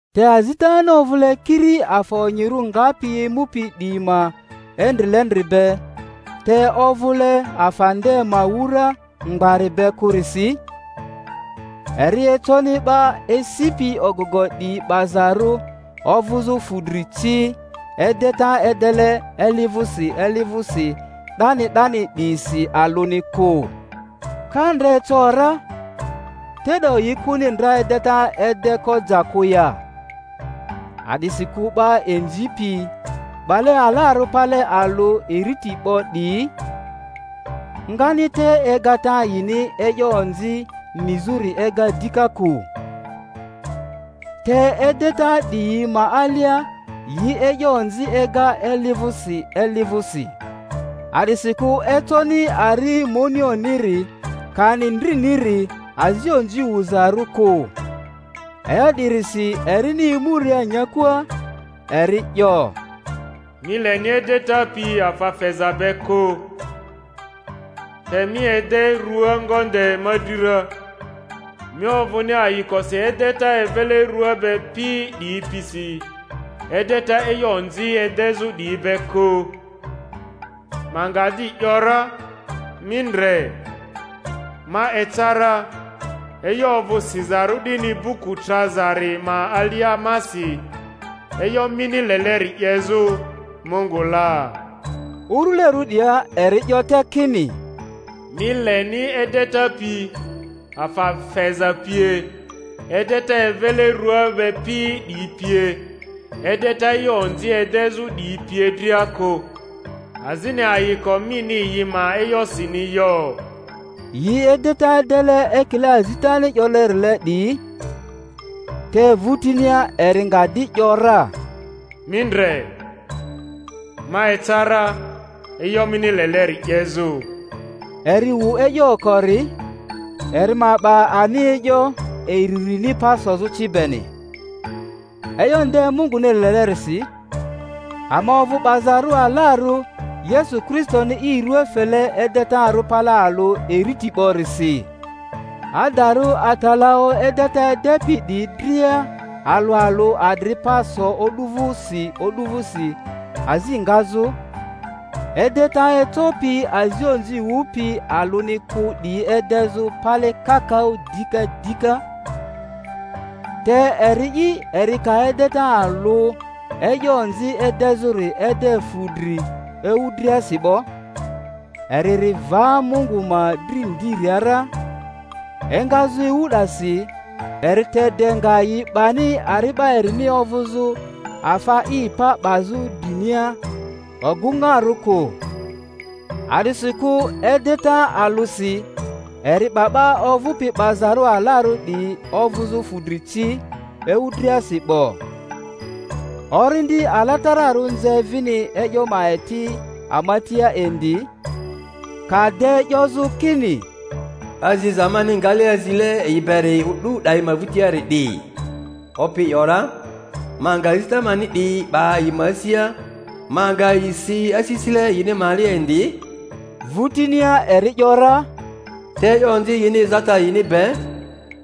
Te azitani ovᴜle kiri afa onyirᴜ ngapi emupi 'diyi ma endrile-ndri be, te ovᴜle afa nde ma wura mgbari be kᴜrisi, eri econi 'ba esipi ogogo 'diyi 'bazarᴜ ovᴜzᴜ fudri ci, edeta edele eli vᴜsi eli vᴜsi 'dani 'dani 'diyisi alᴜni kᴜ. Ka ndra eco ra, te'do yi kᴜni ndra edeta edeko ja kᴜ ya? A'disikᴜ 'ba inzipi, 'bale alarᴜ pale alᴜ iriti 'bo 'diyi, ngani te egata yini e'yo onzi nizᴜri ega dika kᴜ. Te edeta 'diyi ma alia yi e'yo onzi ega eli vᴜsi eli vᴜsi. A'disikᴜ econi ari monioniri kani ndriniri azi onzi wuzarᴜ kᴜ. E'yo 'dirisi erini emuria nyakua, eri 'yo, Mi leni edeta pi afa feza be kᴜ, te mi ede rua ngonde ma dri ra; mi ovᴜni ayikosi edeta evele rᴜa be pi 'diyi pisi, edeta e'yo onzi edezᴜ 'diyi be kᴜ. Ma nga di ‘yora, Mi ndre, ma eca ra (e'yo ovᴜ sizarᴜ 'dini buku trazari ma alia masi) e'yo mini leleri 'yezᴜ, Mungu la. Urulerᴜ 'dia, eri 'yo te kini, Mi leni edeta pi, afa feza pie, edeta evele rua be pi 'diyi pie, edeta e'yo onzi edezᴜ 'diyi pie dria kᴜ, azini ayiko mini yi ma e'yosini yo (yi edeta edele ekile azitani 'yolerile 'diyi), te vᴜtinia eri nga di ‘yora, Mi ndre, ma eca ra e'yo mini leleri 'yezᴜ. Eri wu e'yo okori, eri ma 'ba ani e'yo iririni pa sozᴜ ci beni. E'yo nde Munguni lelerisi, ama ovᴜ 'bazarᴜ alarᴜ Yesu Kristoni i rua fele edetarᴜ pale alᴜ iriti 'borisi. Adarᴜ atalaᴜ edeta edepi 'diyi dria alᴜ alᴜ adri pa so o'du vᴜsi o'du vᴜsi azi ngazᴜ, edeta ecopi azi onzi wupi alᴜni kᴜ 'diyi edezᴜ pale kakaᴜ dika dika. Te eri'i, eri ka edeta alᴜ e'yo onzi edezᴜri ede fudri ewu driasi 'bo, eri ri va Mungu ma dri ndiria ra; engazᴜ ewu 'dasi eri te de nga yi 'bani ari'ba erini ovᴜzᴜ afa i pa 'bazᴜ drinia ogᴜŋarᴜ kᴜ. A'disikᴜ edeta alᴜsi eri 'ba 'ba ovᴜpi 'bazarᴜ alarᴜ 'diyi ovᴜzᴜ fudri ci ewu driasi 'bo. Orindi Ala-tararᴜ nze vini e'yo ma eti ama tia indi; ka de 'yozᴜ kini, Aziza mani ngale azile yi beri o'du 'dayi ma vᴜriari 'di, Opi 'yo ra: Ma nga azita mani 'diyi 'ba yi ma asia, ma nga yi si asisile yini ma alia indi; vᴜtinia eri ‘yora, Te e'yo onzi yini ezata yini be,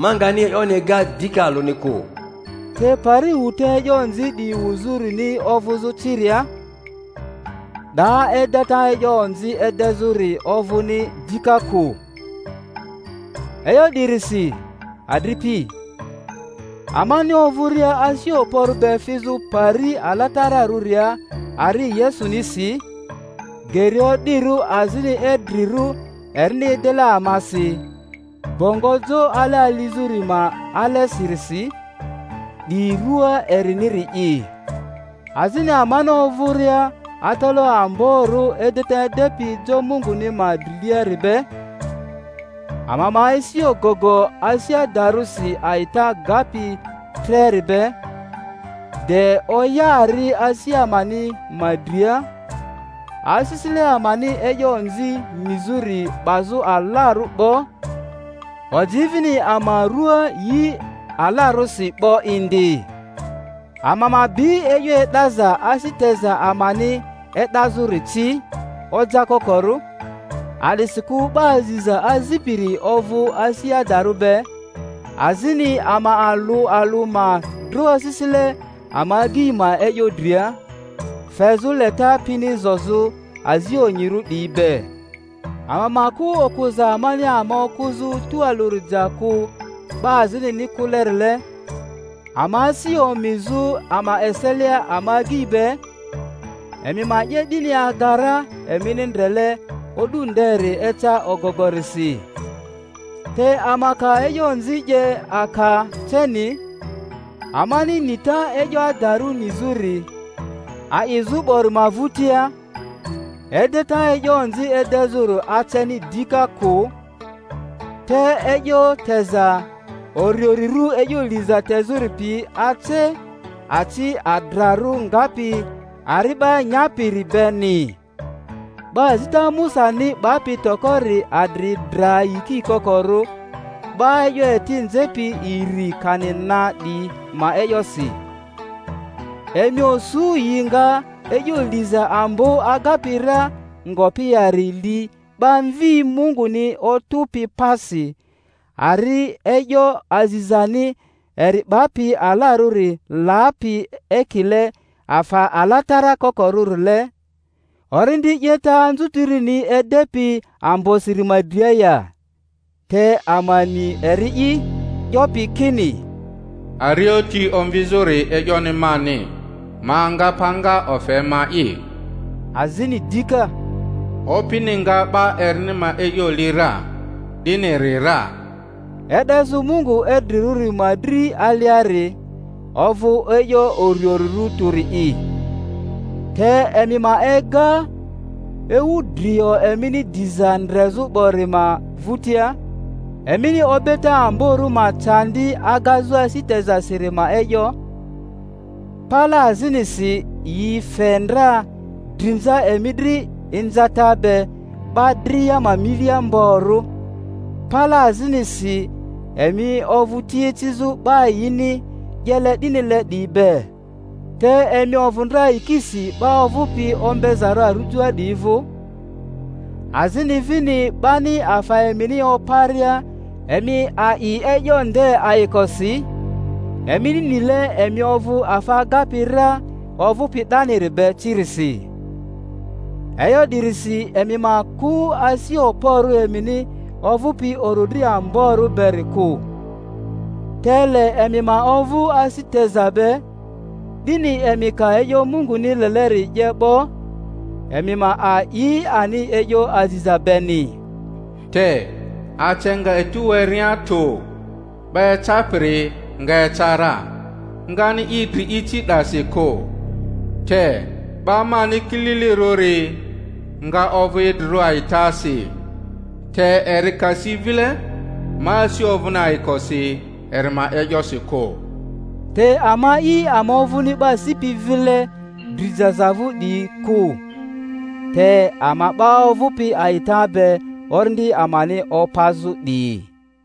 ma ngani e'yoni ega dika alᴜni kᴜ. Te pari wuta e'yo 'diyi wuzᴜrini ovᴜzᴜ ciria, 'daa edeta e'yo onzi edezᴜri ovᴜni dika kᴜ. E'yo 'dirisi, adripi, amani ovᴜria asi okporᴜ be fizᴜ pari alatararᴜria ari Yesunisi, geri o'dirᴜ azini idrirᴜ erini edele amasi, bongo jo ale alizᴜri ma alesirisi, 'di rua eriniri'i; azini amani ovᴜria atalaᴜ amborᴜ edeta edepi jo Munguni ma driliari be; ama ma esi ogogo asi adarᴜsi a'ita gapi treri be, de oya ari asi amani ma dria, asisile amani e'yo onzi nizᴜri 'bazᴜ alarᴜ 'bo, oji vini ama rua yi alarosi 'bo indi. Ama ma bi e'yo e'daza asi teza amani e'dazᴜri ci ojakokorᴜ, a'disikᴜ 'ba aziza azipiri ovᴜ asi adarᴜ be; azini ama alᴜ alᴜ ma dro asisile ama agyi ma e'yo dria, fezᴜ leta pini zozᴜ azi onyirᴜ 'diyi be; ama ma kᴜ okᴜza amani ama okᴜzᴜ tᴜalᴜri ja kᴜ 'ba azinini kᴜlerile, ama asi omizᴜ ama eselia ama agyi be; emi ma 'ye 'dini aga ra emini ndrele O'du nderi eca ogogo-risi. Te ama ka e'yo onzi 'ye aka ceni, amani nita e'yo adarᴜ nizᴜri a'izᴜ 'bori ma vᴜtia, edeta e'yo onzi edezᴜri aceni dika kᴜ, te e'yo teza uriurirᴜ e'yo liza tezᴜri pi ace, aci adrarᴜ ngapi ari'ba nyapiri beni. 'Ba azita Musani 'bapi tokori adri dra yiki kokorᴜ 'ba e'yo eti nzepi iri kani na 'diyi ma e'yosi. Emi osu yi nga e'yo liza ambo agapi ra ngopi yari li 'ba Mvi Munguni otᴜpi pasi, ari e'yo azizani eri 'bapi alarᴜri lapi ekile afa alatara kokorᴜrile, Orindi 'yeta anzutirini edepi ambosiri ma dria ya? Te ama ni eri'i 'yopi kini, Arioti omvizᴜri e'yoni mani, ma nga panga ofe ma'i; azini dika, Opini nga 'ba erini ma e'yo li ra, 'diniri ra. E'dezᴜ Mungu idrirᴜri ma dri aliari ovᴜ e'yo uriurirᴜ tᴜri'i. Te emi ma ega ewu drio emini diza ndrezᴜ 'bori ma vᴜtia, emini obeta amborᴜ ma candi agazᴜ asi tezasiri ma e'yo; pale azinisi yi fe ndra drinza emi dri inzata be 'ba dria ma milia mgborᴜ, pale azinisi emi ovᴜ ti ecizᴜ 'ba yini 'yele 'dinile 'diyi be. Te emi ovᴜ ndra yikisi 'ba ovᴜpi ombezarᴜ arujoa 'diyi vᴜ, azini vini 'bani afa emini oparia emi a'i e'yo nde ayikosi, emini nile emi ovᴜ afa agapi ra ovᴜpi 'daniri be cirisi. E'yo 'dirisi emi ma kᴜ asi okporᴜ emini ovᴜpi orodri amborᴜ beri kᴜ. Te le emi ma ovᴜ asi teza be, 'dini emi ka e'yo Munguni leleri 'ye 'bo, emi ma a'i ani e'yo aziza beni. Te ace nga etu werea tᴜ 'ba ecapiri nga eca ra, ngani i dri ici 'dasi kᴜ; te 'ba mani kililirᴜri nga ovᴜ idrirᴜ a'itasi, te eri ka si vile, ma asi ovᴜni ayikosi eri ma e'yosi kᴜ. Te ama'i ama ovᴜni 'ba sipi vile dri jaza vᴜ 'diyi kᴜ, te ama 'ba ovᴜpi a'ita be orindi amani opazᴜ 'diyi.